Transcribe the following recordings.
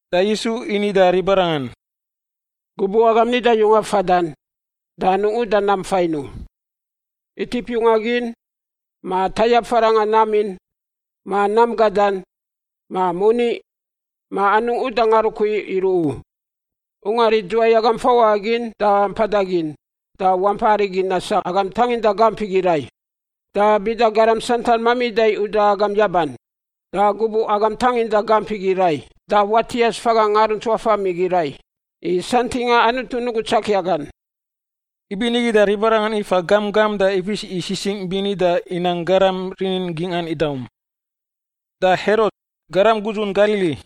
Da Yisu ini da ribarangan, “Gubuꞌ agam nida yunga fadan, da anungꞌ uda nam fain u — itip yunga gin, ma tayap farangꞌa nam in, ma nam gadan, ma moni, ma anungꞌ uda ngarukui iruꞌ u. Ungar idzuwai agam fawaꞌa gin da mpada gin, da wampai arigi nasangꞌ agam tanginda gamp igi rai. Da bida garam santan mamida uda agam yaban, da gubuꞌ agam tanginda gamp igi rai da watias faga ngaruntsuafam igi rai, i santingꞌa Anutu nugu tsakia gan.” Ibinigi da ribarangan ifa gamp gamp da ifis i sisingꞌ bini da inang garam rinin gingꞌan idaum. Da Herot, garam gudzun Galili,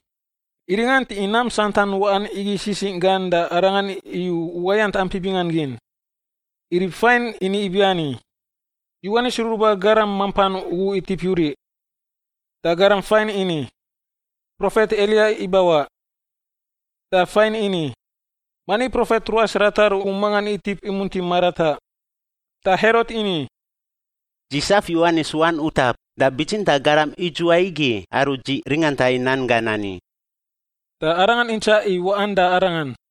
iringanti i nam santan waꞌan igi sisingꞌ gan da arangan iyu uwayant ampi bingan gin. I rib fain ini ibiani, “Yowanis Ruruba Garam mampan ugu itip yuriꞌ,” da garam fain ini, “Profet Eliya ibawaꞌ,” da faingꞌ ini, “Mani profet ruas ratar ugu mangan itip imunti marataꞌ.” Da Herot ini, “Dzi saf Yowanis wan utap da bitsintaꞌ garam idzuwai igi aru dzi ringanta i nan gan ani?” Da arangan intsaꞌ i waꞌan da Arangan.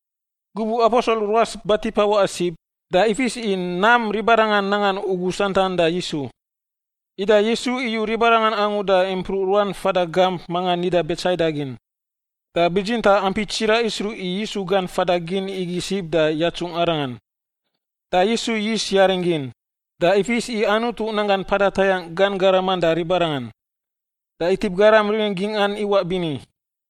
Gubuꞌ aposel ruas batipa waꞌa sib, da ifis i nam ribarangan nangan ugu santan da Yisu. Ida Yisu iyu ribarangan angu da impruꞌ ruan fada gamp manga nida Betsaida gin. Da bitsintaꞌ ampi tsiraꞌ isruꞌ i Yisu gan fada gin igi sib da yatsungꞌ Arangan. Da Yisu yis yaring gin, da ifis i Anutu nanggan mpada tayangꞌ gan garaman da ribarangan, da itip garam rinin gingꞌan iwaꞌ bini.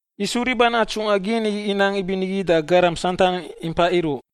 Yisu riban atsungꞌa gin inang ibinigi da garam santan impai iruꞌ.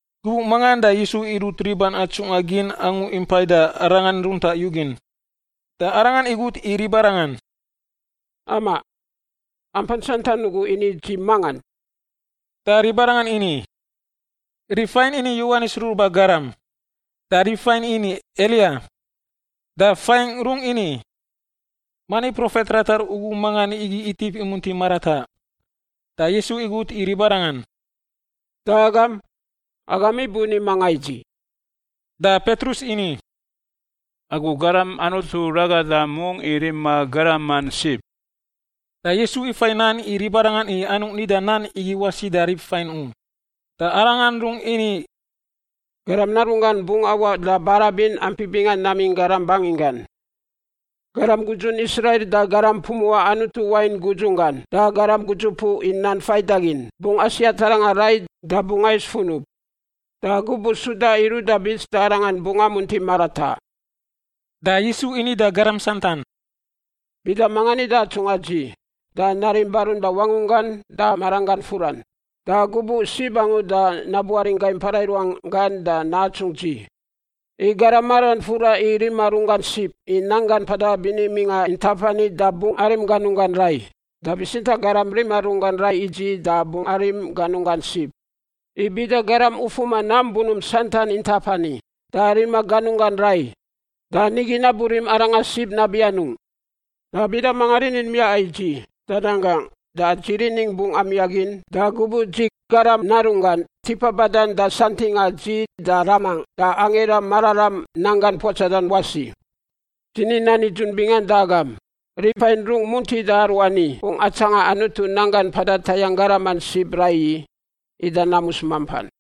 Gubuꞌ mangan da Yisu irut riban atsungꞌa gin angu impai da Arangan runtaꞌ yugin, da Arangan igut i ribarangan, “Amaꞌ, ampan santan ugu ini dzi mangan?” Da ribarangan ini, “Rib fain ini Yowanis Ruruba Garam, da rib fain ini Eliya, da fain rungꞌ ini, ‘Mani profet ratar ugu mangan igi itip imunti marataꞌ.’” Da Yisu igut i ribarangan, “Da agam? Agam ibuni manga i dzi?” Da Petrus ini, “Agu Garam Anutu Ragada mungꞌ i rima garaman sib.” Da Yisu ifai nan i ribarangan i anungꞌ nida nan igi wasi da rib fain u. Da Arangan rungꞌ ini, “Garam Narunggan bungꞌ awaꞌ da barabin ampi bingan namingꞌ garam banginggan. Garam gudzun Israil, da garam pumuꞌa Anutu wain gudzun gan, da garam gudzupuꞌ i nan faidagin bungꞌ asiat arangan rai da bungꞌ ais funub, da gubuꞌ suda iruꞌ da bits da arangan bungꞌ amunti marataꞌ.” Da Yisu ini da garam santan, “Bida manga nida atsungꞌa dzi da narim barun da wangunggan da maranggan furan, da gubuꞌ sib angu da nabuaringꞌ gai mpara i ruan gan da natsungꞌ dzi. I garam maran fura i rima runggan sib i nanggan mpada bini mingꞌa intap ani da bungꞌ arim ganunggan rai, da bitsintaꞌ garam rima runggan rai i dzi da bungꞌ arim ganunggan sib. I bida garam ufuma nam bunump santan intap ani, da rima ganunggan rai, da nigi naburim arangan sib nabi anungꞌ? Da bida manga rinin miaꞌa i dzi da nan gangꞌ, da dzi riningꞌ bungꞌ amiaꞌ gin da gubuꞌ dzi, Garam Narunggan, tipa badan da santingꞌa dzi da Ramangꞌ da angira mararam nanggangꞌ puatsadan wasi. Dzi ni nan nidzun bingan da agam, rib fain rungꞌ muntida aruani bungꞌ atsanga Anutu nanggan mpada tayangꞌ garaman sib raiyi, ida namus mampan.”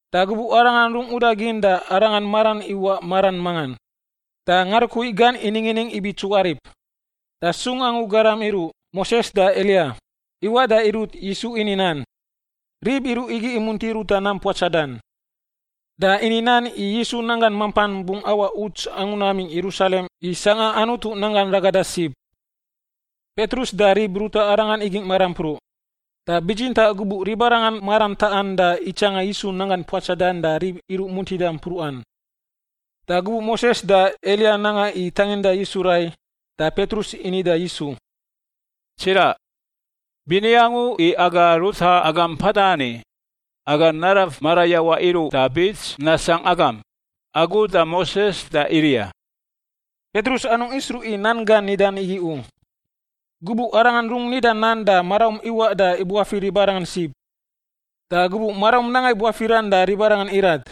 Da gubuꞌ Arangan rungꞌ udagin da Arangan maran iwaꞌ maran mangan, da ngarukui gan iningining ibi tsuarip. Da sung angu garam iruꞌ, Moses da Eliya, iwaꞌ da irut Yisu ini nan. Rib iruꞌ igi imunti ruta nam puatsadan, da ini nan i Yisu nanggan mampan bungꞌ awaꞌ uts angu namingꞌ Yerusalem i sangꞌa Anutu nan gan ragada sib. Petrus da rib ruta arangan igingꞌ marampruꞌ, da bitsintaꞌ gubuꞌ ribarangan maran taꞌan da itsanga Yisu nanggan puatsadan da rib iruꞌ muntidan mpruꞌan. Da gubuꞌ Moses da Eliya nanga i tanginda Yisu rai, da Petrus ini da Yisu, “Tsiraꞌ, bini angu i aga ruta agam mpada ani; aga naraf marayawaꞌ iruꞌ da bits nasangꞌ agam — agu, da Moses, da Eliya.” (Petrus anungꞌ isruꞌ i nan gan nidan igi u.) Gubuꞌ arangan rungꞌ nida nan da maraum iwaꞌ da ibuafir ribarangan sib, da gubuꞌ maraum nanga i buafiran da ribarangan irat.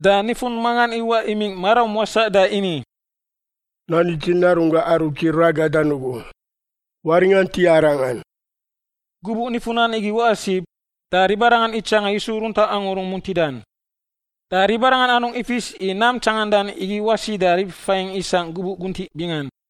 Da nifun mangan iwaꞌ imingꞌ maraum wasaꞌ da ini, “Nani dzi Narunggangꞌ aru dzi ragadan ugu; waringant i Arangan.” Gubuꞌ nifun nan igi waꞌa sib, da ribarangan itsanga Yisu runtaꞌ angu rungꞌ muntidan. Da ribarangan anungꞌ ifis i nam tsangandan igi wasi da rib fain isangꞌ gubuꞌ guntiꞌ bingan.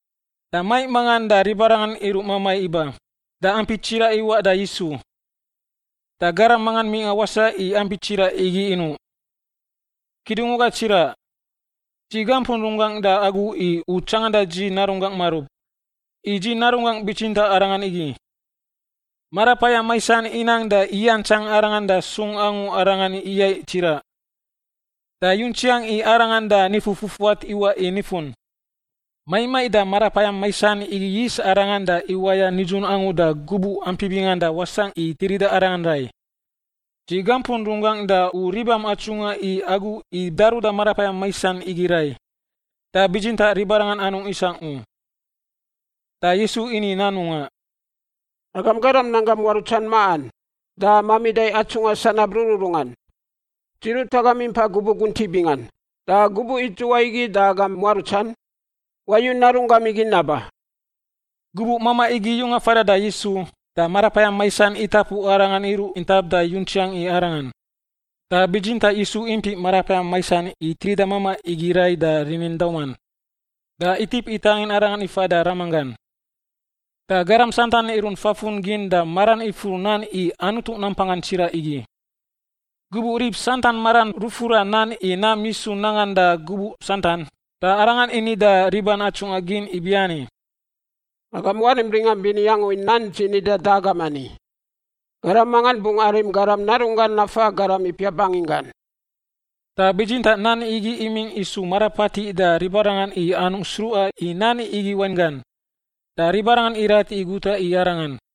Da maiꞌ mangan da ribarangan iruꞌ mamai iba, da ampi tsiraꞌ iwaꞌ da Yisu. Da garam manga mingꞌa wasaꞌ i ampi tsiraꞌ igi inuꞌ, “Kidungwaga tsiraꞌ, dzi gampun runggangꞌ da agu i u tsanganda dzi narunggangꞌ marub. I dzi narunggangꞌ bitsintaꞌ arangan igi. Marapayam maisan inang da iyantsang arangan da sung angu arangan iyaiꞌ tsiraꞌ. Da yuntsiang i arangan da nifu fufuat iwaꞌ i nifun. Maiꞌ maiꞌ da marapayam maisan igi yis arangan da iwaya nidzun angu da gubuꞌ ampi bingan da wasangꞌ i tirida arangan rai. Dzi gampun runggangꞌ da u ribam atsungꞌa i agu i daruda marapayam maisan igi rai, da bitsintaꞌ ribarangan anungꞌ isangꞌ u.” Da Yisu ini nan mungaꞌ, “Agam garam nanggam muarutsan maꞌan da mamida atsungꞌa sanab rururungan! Dzi rut agam impai gubuꞌ guntiꞌ bingan, da gubuꞌ idzuwai igi da agam muarutsan? Wayu narunggam igi naba.” Gubuꞌ mamaꞌ igi yunga fadan da Yisu, da marapayam maisan itapu arangan iruꞌ intap da yuntsiang i arangan. Da bitsintaꞌ Yisu impiꞌ marapayam maisan i tirida mamaꞌ igi rai da rinin dauman, da itip itangin arangan ifa da ramanggan. Da garam santan irunt fafun gin da maran ifur nan i Anutu nampanggan tsiraꞌ igi. Gubuꞌ rib santan maran rufura nan i nam Yisu nangan da gubuꞌ santan, da Arangan ini da riban atsungꞌa gin ibiani, “Agam warim ringam bini angu i nan dzi nidan da agam ani! Garam mangan bungꞌ arim Garam Narunggan nafa garam ipiap banginggan.” Da bitsintaꞌ nan igi imingꞌ isu marapatiꞌ da ribarangan i anungꞌ sruꞌa i nan igi wainggan, da ribarangan irat i guta i Arangan.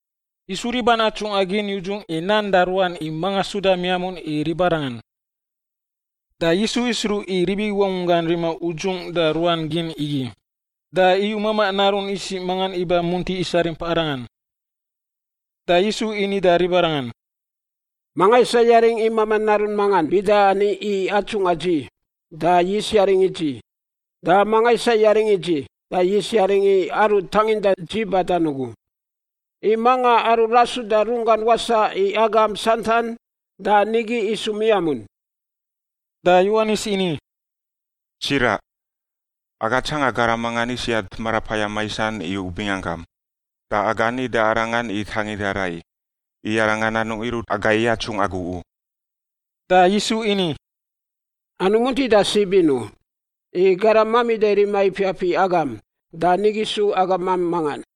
Yisu riban atsungꞌa gin yudzungꞌ i nan da ruan i manga suda miamun i ribarangan. Da Yisu isruꞌ i rib igi wangunggan rima udzungꞌ da ruan gin igi, da iyu mamaꞌ narun isiꞌ mangan iba munti isarimp Arangan. Da Yisu ini da ribarangan, “Manga isa yaringꞌ i mamaꞌ narun mangan bida ani i atsungꞌa dzi, da yis yaringꞌ i dzi. Da manga isa yaringꞌ i dzi, da yis yaringꞌ i aru tanginda dzi badan ugu. I manga aru rasuda runggan wasaꞌ i agam santan da nigi isu miamun.” Da Yowanis ini, “Tsiraꞌ, aga tsanga garam mangan isiat marapayam maisan i u binganggam, da aga ni da arangan i tanginda rai, i arangan anungꞌ irut agai yatsungꞌ agu u.” Da Yisu ini, “Anungꞌ muntida sib in u, i garam mamida rima ipiap i agam da nigi su agamam mangan.”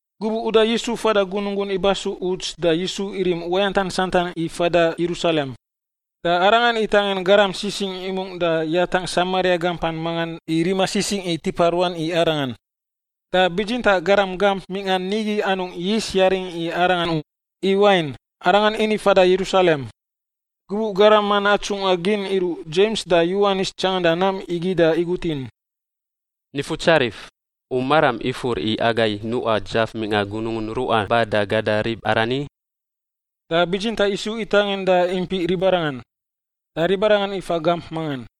Gubuꞌ uda Yisu fada gunungun ibasu uts da Yisu irim uwayantan santan i fada Yerusalem. Da Arangan itangin garam sisingꞌ imungꞌ da yatangꞌ Samaria gampan mangan i rima sisingꞌ i tipa ruan i Arangan. Da bitsintaꞌ garam gamp mingꞌa nigi anungꞌ yis yaring i Arangan u, i wain, Arangan ini fada Yerusalem. Gubuꞌ garaman atsungꞌa gin iruꞌ Dzems da Yowanis tsanganda nam igi da igut in, “Nifutsarif, u maram ifur i agai nuꞌa dzaf mingꞌa gunungun ruꞌa ba da gada rib arani?” Da bitsintaꞌ Yisu itaningꞌ da impiꞌ ribarangan, da ribarangan ifa gamp mangan.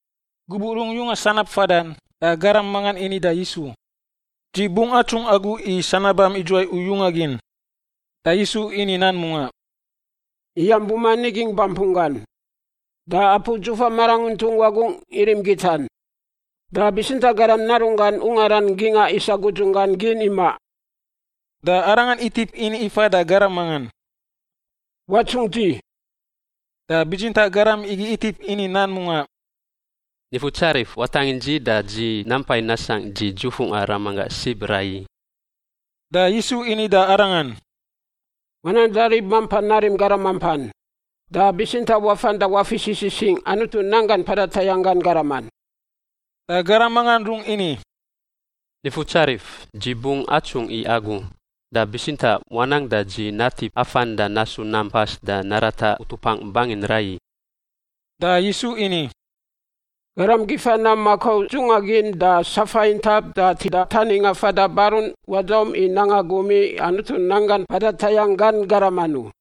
Gubuꞌ rungꞌ yunga sanab fadan, da garam mangan ini da Yisu, “Dzi bungꞌ atsungꞌ agu i sanabam idzuwai u yunga gin.” Da Yisu ini nan mungaꞌ, “Iyam buman igingꞌ bampun gan, da apu dzufa maranguntung wagungꞌ irim gitan. Da bitsintaꞌ Garam Narunggan ungaran gingꞌa isa gudzunggan gin imaꞌ.” Da Arangan itip ini ifa da garam mangan, “Watsungꞌ dzi.” Da bitsintaꞌ garam igi itip ini nan mungaꞌ, “Nifutsarif, watangin dzi da dzi nampai nasangꞌ dzi dzufungꞌa ramanggangꞌ sib raiyi.” Da Yisu ini da arangan, “Wanang da rib mampan narim garaman mampan, da bitsintaꞌ wafan da wafis i sisingꞌ Anutu nanggan mpada tayangꞌ gan garaman.” Da garam mangan rungꞌ ini, “Nifutsarif, dzi bungꞌ atsungꞌ i agu, da bitsintaꞌ wanang da dzi natip afan da nasu nam pas da narata utupangꞌ bangin raiyi.” Da Yisu ini, “Garam gifa nam makau dzungꞌa gin da safa intap da tida taningꞌa fada barun wadaum i nanga gum i Anutu nanggan mpada tayangꞌ gan garaman u.”